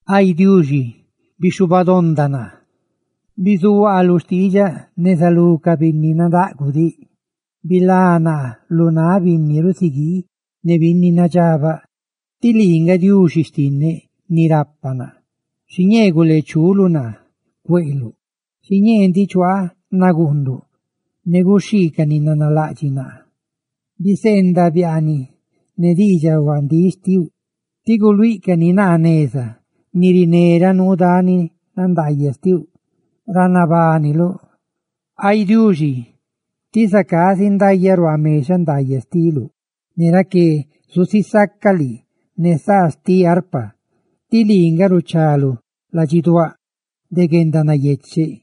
Ay Diuxi, bixhubadonda naa; ¡bizuaa lu xtiidxaꞌ neza lú ca binni nadaꞌguꞌ diꞌ! ¡Bilá naa lu náꞌ binni rusiguii ne binni nadxabaꞌ, tí lii nga Diuxi xtinneꞌ ni rapa naa! Xiñee guleechuluꞌ naa cueꞌluꞌ. Xiñee ndiꞌ chuaaꞌ naguunduꞌ ne guxhii ca ni nanalaꞌdxiꞌ naa ca naa. Biseendaꞌ biaaniꞌ ne diidxaꞌ huandíꞌ xtiuꞌ, tí guluíꞌcani naa neza ni riné ra nuu dani nandaayaꞌ xtiuꞌ, ra nabániluꞌ. Ay Diuxi, ti zacá zindayaꞌ ruaa mexaꞌ ndaayaꞌ xtiluꞌ, ne raqué zusisaca lii ne saa xtiꞌ arpa, tí lii nga ruchaluꞌ ladxiduáꞌ de guendanayecheꞌ.